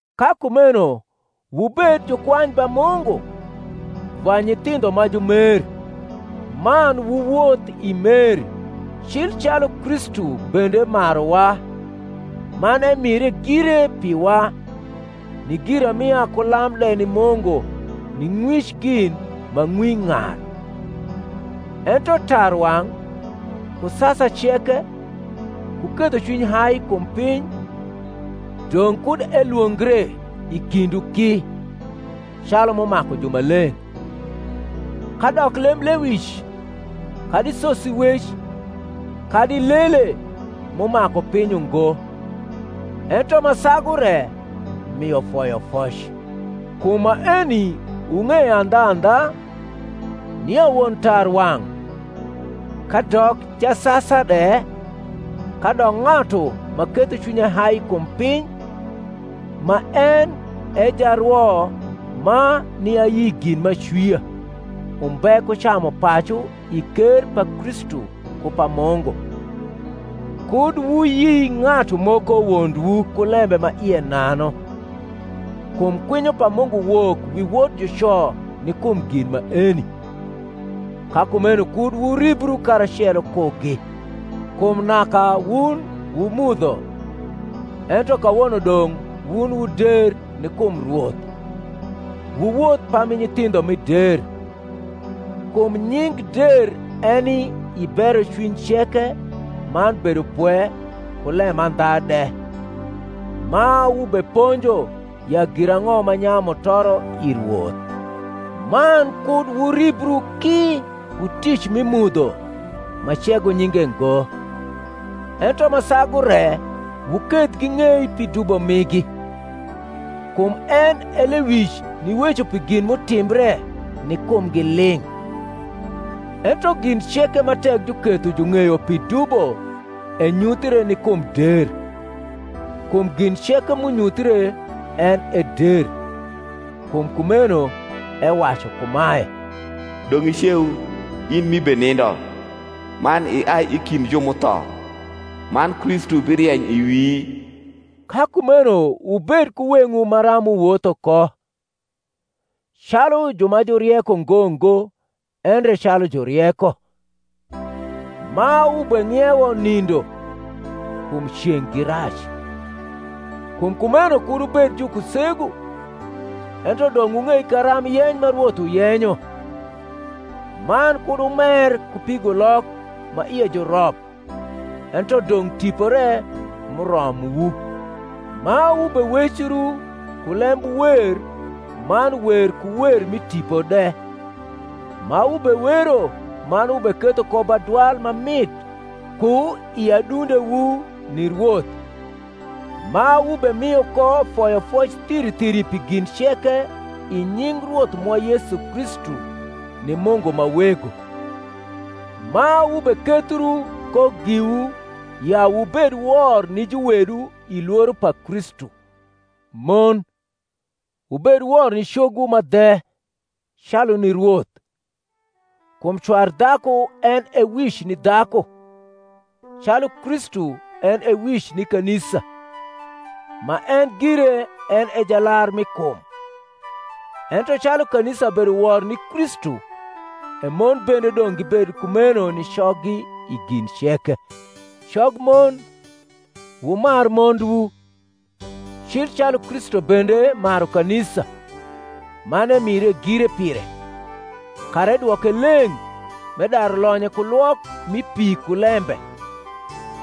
Ka kumeno wubed jukwany ba Mungu, va nyithindho ma jumer; man wuwoth i mer, cil calu Kristu bende maruwa, man emire gire piwa, ni giramia ku lam de ni Mungu ni ng’wic gin ma ng’wi ng’ar. Ento tarwang’, ku sasa ceke, ku kethocwiny hai kum piny, dong’ kud elwongre i kindwu ki, calu m’umaku jumaleng’; kadok lemblewic, kadi sosiwec, kadi lele, m’umaku piny ungo: ento ma sagu re mio foyofoc. Kum maeni wung’eyo andhandha, nia won tarwang’, kadok jasasa de, kadok ng’atu ma ketho cwinye hai kum piny, ma en e jarwo ma ni ayi gin ma acwia, umbe ku camupacu i ker pa Kristu ku pa Mungu. Kud wuyi ng’atu moko wondwu ku lembe ma ie nanu: kum kwinyo pa Mungu wok wi wot juco ni kum gin maeni. Ka kumeno kud wuribru karacelo kugi; kum naka wun wu mudho, ento kawono dong’ wun wu der ni kum Rwoth: wuwoth pami nyithindho mi der (kum nying’ der eni i berocwiny ceke man bedopwe ku lemandha de), ma wubeponjo ya girang’o ma nyayu mutoro i Rwoth; man kud wuribru ki ku tic mi mudho ma cego nyinge ngo, ento ma sagu re wuketh ging’ei pi dubo migi; kum en e lewic niweco pi gin m’utimbre ni kumgi ling’. Ento gin ceke ma tek juketho jung’eyo pi dubo enyuthie ni kum der: kum gin ceke m’unyuthre en e der. Kum kumeno ewacu kumae, Dong’ iceu, in ni’ibenindo, man iai i kind ju m’utho, man Kristu birieny i wii. Ka kumeno wubed ku weng’wu maram wuwotho ko, calu ju ma jurieko ngo ngo, endre calu jurieko; ma wubeng’iewo nindo, kum ceng’ gi rac. Kum kumeno kud wubed jukusegu, ento dong’ wung’ei karamb yeny ma Rwoth uyenyo. Man kud wumer ku pigulok, ma ie ju rop, ento dong’ Tipo re m’uromwu; ma wubewecru ku lembwer man wer ku wer mi tipo de, ma wubewero man wubeketho ko badwal ma mit ku i adundewu ni Rwoth; ma wubemio ko foyofoc thiri thiri pi gin ceke i nying Rwoth mwa Yesu Kristu ni Mungu ma Wego. Ma wubekethru ko giwu ya wubed wor ni juwedu i lworo pa Kristu. Mon, wubed wor ni cogwu ma dhe, calu ni Rwoth. Kum cwar dhaku en e wic ni dhaku, calu Kristu en e wic ni kanisa, ma en gire en e jalar mi kum. Ento calu kanisa bedo wor ni Kristu, e mon bende dong’ gibed kumeno ni coggi i gin ceke. Cogmon, wumar mondwu, cil calu Kristu bende maru kanisa, man emire gire pire; kara edwoke leng’, m’edaru lonye ku lwok mi pi ku lembe,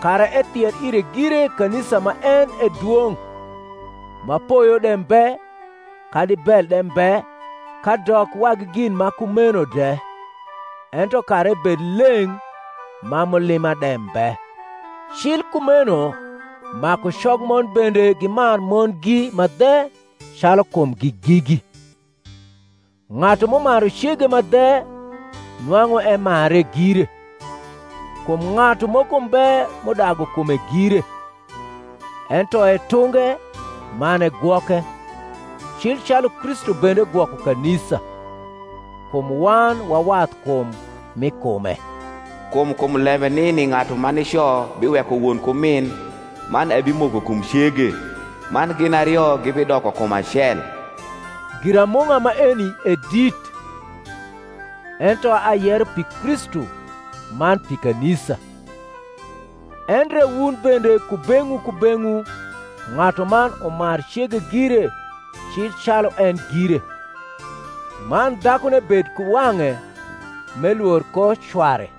kara ethier ire gire kanisa ma en e dwong’, ma poyo de mbe kadi bel de mbe kadok wagi gin ma kumeno de; ento kara ebed leng’ ma mulima de mbe. Cil kumeno maku cogmon bende gimar mondgi ma dhe calu kumgi gigi. Ng’atu m’umaru cege ma dhe nwang’u emare gire; kum ng’atu moko mbe m’udagu kume gire; ento etunge man egwoke, cil calu Kristu bende gwoko kanisa; kum wan wa wathkum mi kume. Kum kum lembe nini ng’atu ma nico biweko won ku min, man ebimoko kum cege; man gin ario gibidoko kum acel. Giramung’a maeni e dit; ento ayero pi Kristu man pi kanisa. Endre wun bende kubeng’wu kubeng’wu ng’atuman umar cege gire cil calu en gire; man dhakune bed ku wang’e m’elwor ko cware.